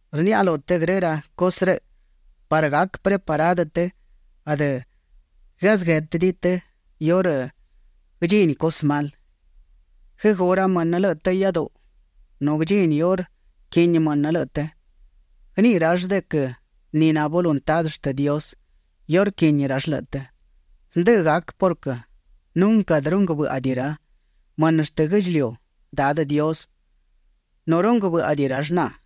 ’Rniaꞌa lu të grë ra cusë rëꞌ parë gac preparadë të, të adë guëazë guétëdiꞌi të iurë guëdchini cusë mal. Guëgú ra mënë lëꞌë të iáduꞌu nu guëdchini iurë quini mënë lëꞌë të. Guëniꞌi rall de quë ni na voluntá shtë Dios iurë quini rall lëꞌë të. Zndëꞌë gac purquë nunquë adë runguë bë́ꞌadiꞌi ra mënë shtë guë́ꞌdchiliu Dadë Dios nu runguë bë́ꞌadiꞌi rall na.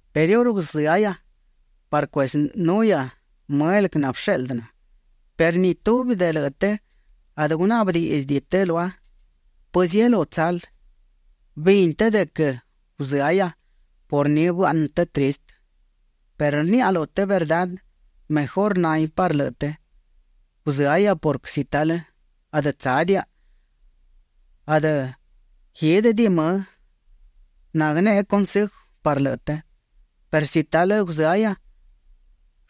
perë iurneꞌ guzëahia parë cuezënúhia më el quë nabësheꞌldë na. Perë ni tubi de lëꞌë të adë gunaꞌbë díꞌdzëdiꞌi të lua: “¿Pëzielú tsal?” Bini të de quë guzëahia, por ni bëaꞌnë të tristë perë rniaꞌa lu të verdá, mejurë nahin parë lëꞌë të. Guzëahia purquë si talë adë tsádiaꞌa, adë guídëdiꞌi më naguëneꞌe cunseju parë lëꞌë të, perë si talë guzëahia,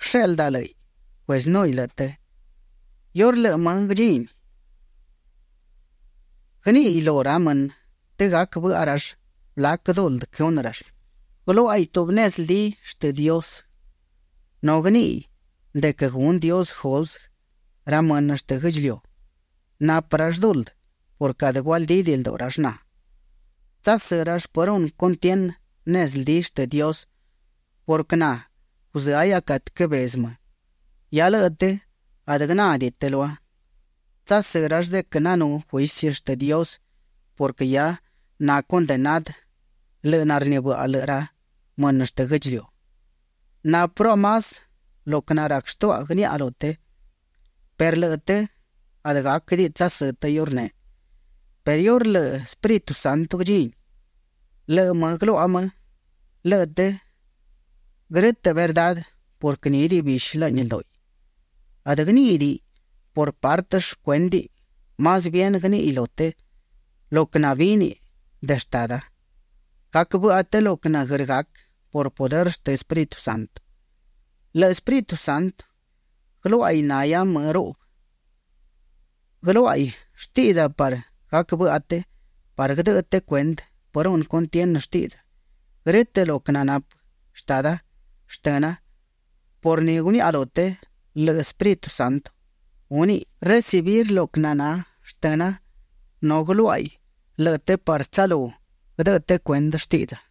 guësheꞌlda lë́ꞌiꞌ; cuezënúhiꞌ lëꞌë të. Iurë lëꞌë më guëdchini, guëníꞌiꞌ lu ra mënë të gac bëꞌa rall blac duldë quëhunë rall. Guëluáꞌaiꞌ tubi nezë ldi shtë Dios, nu guëníꞌiꞌ de quë gunë Dios juzguë ra mënë shtë guë́ꞌdchiliu. Napë rall duldë purquë adë gualdídiꞌi lduꞌu rall na. Tsasë́ rall pë runë cuntienë nezë ldi shtë Dios purquë na guzëahia catë quëbezë më. Hia lëꞌë të adë guënádiꞌi të lua. Tsasë́ rall de quë nanú juici shtë Dios purquë hia nacondenadë lëꞌë narnibëꞌa lëꞌë ra mënë shtë guë́ꞌdchiliu. ’Nápëruaꞌa más lo quë narac shtuaꞌa guëniaꞌa lu të perë lëꞌë të adë gáquëdiꞌi tsasë́ të iurneꞌ. Perë iurë lëꞌë Espíritu Santo guëdchíniꞌ, lëꞌë më guëluaꞌa më lëꞌë të grë́tëꞌ verdá purquë nídiꞌi bishi laꞌni ldúꞌiꞌ. Adë guëníꞌidiꞌiꞌ por partë shcuéndiꞌ; más bien guëníꞌiꞌ lu të lo quë nabíniꞌ de Shtada. Gac bëꞌa të lo quë naguër gac por pudërë shtë Espíritu Santo. Lëꞌë Espíritu Santo guëluáꞌaiꞌ nahia më ruꞌbë. Guëluáꞌaiꞌ shtiꞌdza parë gac bëꞌa të, parë guëdëꞌë të cuendë pë runë cuntienë shtiꞌdza. Grë́tëꞌ lo quë nanapë Shtada, shtëna; por ni guniaꞌa lu të lëꞌë Espíritu Santo gúniꞌ recibir lo quë naná shtëna nu guëluáꞌaiꞌ lëꞌë të parë tsalú guëdëꞌë të cuendë shtiꞌdza.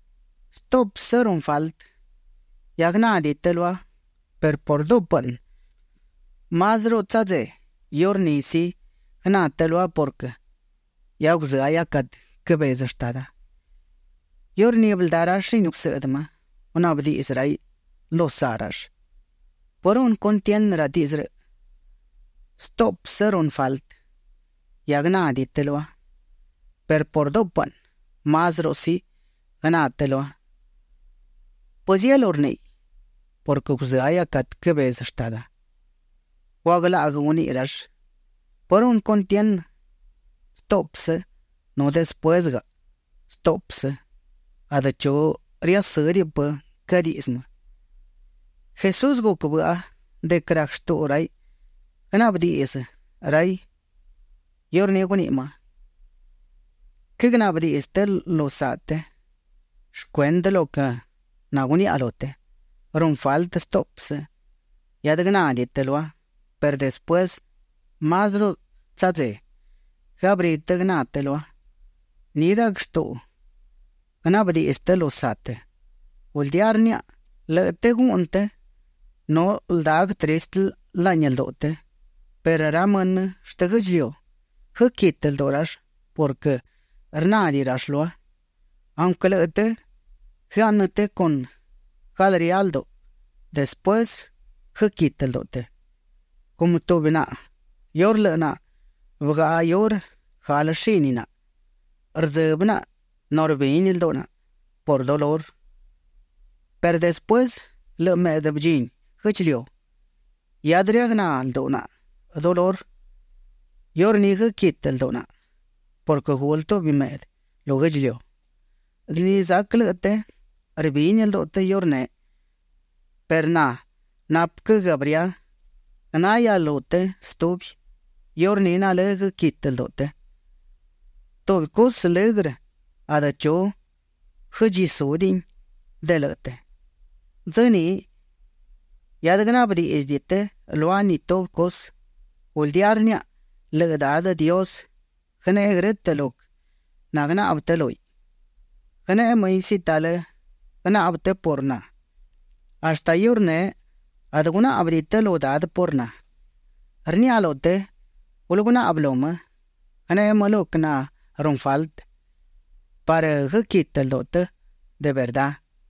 ’Stuꞌpsë runë faltë, hia guënádiꞌi të lua perë por dupëꞌnë másruꞌu tsadzé iurní sí, guëná të lua purquë hia guzëahia catë quëbezë Shtada. Iurní bëldá ra shini gusëꞌdë më gunaꞌbë diꞌdzë raiꞌ lu saꞌ rall: ―¿Pë runë cuntienë ra diꞌdzë rëꞌ: “Stuꞌpsë runë faltë hia guënádiꞌi të lua perë por dupëꞌnë másruꞌu sí, guëná të lua”? ¿Pëzielú rníꞌiꞌ: “Purquë guzëahia catë quëbezë Shtada”? Guaglaꞌguë guniꞌi rall: ―¿Pë runë cuntienë stuꞌpsë nu despuë́sëgaꞌa stuꞌpsë? Adë chu riasë́diꞌi pë quëadiꞌdzë më. Jesús guc bëꞌa de quë rac shtuꞌu raiꞌ guënaꞌbë diꞌdzë raiꞌ. Iurní guniꞌi më: ―Quëgnaꞌbë diꞌdzë të lu saꞌ të shcuendë lo quë naguniaꞌa lu të: “Runë faltë stuꞌpsë; hiadë guënádiꞌi të lua perë despuësë másruꞌu tsadzé, guëabrí të guëná të lua”. Ni rac shtuꞌu guënaꞌbë diꞌdzë të lu saꞌ të. Guldía rniaꞌa, lëꞌë të guꞌnë të nu ldaguë tristë laꞌni lduꞌu të perë ra mënë shtë guë́ꞌdchiliu, guëquitë lduꞌu rall purquë rnádiꞌi rall lua. Aunquë lëꞌë të guëaꞌnë të con galriá lduꞌu, despuësë guëquitë lduꞌu të. Cumë tubi naꞌa iurë lëꞌë naꞌa bëgaꞌa shiurë galë shini naꞌa, rdzëbë naꞌa nu rbini lduꞌu naꞌa por dulurë, perë despuësë lëꞌë meꞌdë bëdchini guë́ꞌdchiliu, hia adë rëagná lduꞌu naꞌa dulurë. Iurní guëquitë lduꞌu naꞌa purquë gulë tubi meꞌdë lu guë́ꞌdchiliu. Zni zac lëꞌë të; rbini lduꞌu të iurneꞌ, perë na napë quë guëabría. Guënahia lu të stubi; iurní nalë́ guëquitë lduꞌu të, tubi cusë lëgrë; adë chu guëdchisúdiꞌin de lëꞌë të. ’Dzë ni hiadë guënáꞌbëdiꞌi diꞌdzë të lua ni tubi cusë. Guldía rniaꞌa, lëꞌë Dadë Dios guëneꞌe grë́tëꞌ lo quë naguënaꞌbë të lúhiꞌ. Guëneꞌe mëhin si talë guënaꞌbë të por na. Hashtë iurneꞌ adë gunáꞌbëdiꞌi të lu Dadë por na. Rniaꞌa lu të, gulë gunaꞌbë lu më. Guëneꞌe më lo quë narunë faltë të parë guëquitë lduꞌu të de verdá.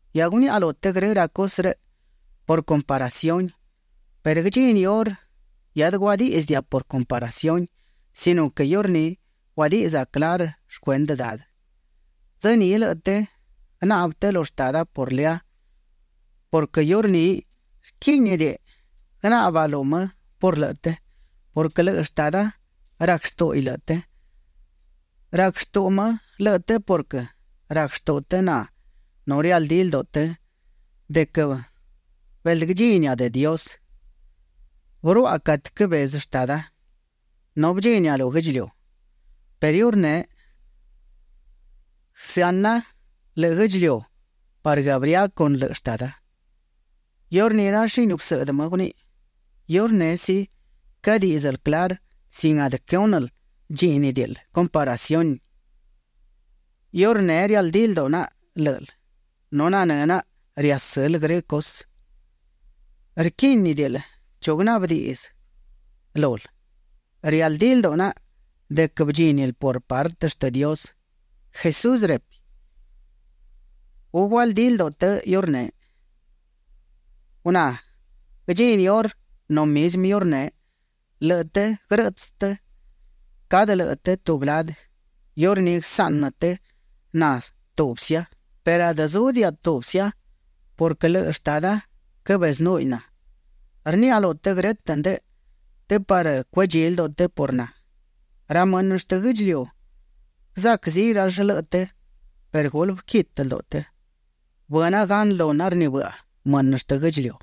’Hia guniaꞌa lu të grë ra cusë rëꞌ por comparaciuni, perë guëdchini iurë hiadë guadíꞌdzëdiaꞌa por comparaciuni sino quë iurní guadiꞌdza clarë shcuendë Dadë. Dzë ni lëꞌë të guënaꞌbë të lu Shtada por lëa purquë iurní rquíꞌnidiꞌi guënaꞌba lu më por lëꞌë të purquë lëꞌë Shtádaꞌa rac shtúꞌuiꞌ lëꞌë të. Rac shtuꞌu më lëꞌë të purquë rac shtuꞌu të na nu rialdí lduꞌu të de quë beldë guëdchinia de Dios. Bëruaꞌa catë quëbezë Shtada nu bëdchinia lu guë́ꞌdchiliu, perë iurneꞌ guësaꞌna lëꞌë guë́ꞌdchiliu parë guëabría con lëꞌë Shtada. Iurní ra shini gusëꞌdë më guniꞌi: ―Iurneꞌ sí, quëadíꞌdzël clarë sin adë quëhunë dchíꞌnidiꞌil comparaciuni. Iurneꞌ rialdí lduꞌu naꞌa lë́ꞌël nu nanë́ naꞌa riasël grë cusë. Rquíꞌnidiꞌil chu guënaꞌbë diꞌdzë lul. Rialdí lduꞌu naꞌa de quë bëdchínil por partë shtë Dios. Jesús repi: ―¿Gu gualdí lduꞌu të iurneꞌ? Guná, guëdchini iurë nu mizmë iurneꞌ, lëꞌë të guërëꞌtsë të cadë lëꞌë të tubi ladë. Iurní guësaꞌnë të na tubsia, perë adë zúdiaꞌa tubsia purquë lëꞌë Shtada quëbezënúhiꞌ na. Rniaꞌa lu të grë́tëꞌ ndëꞌë të parë cuedchí lduꞌu të por na. Ra mënë shtë guë́ꞌdchiliu guëzac zi rall lëꞌë të perë gulë bëquitë lduꞌu të. Bëna gan lu narnibëꞌa mënë shtë guë́ꞌdchiliu.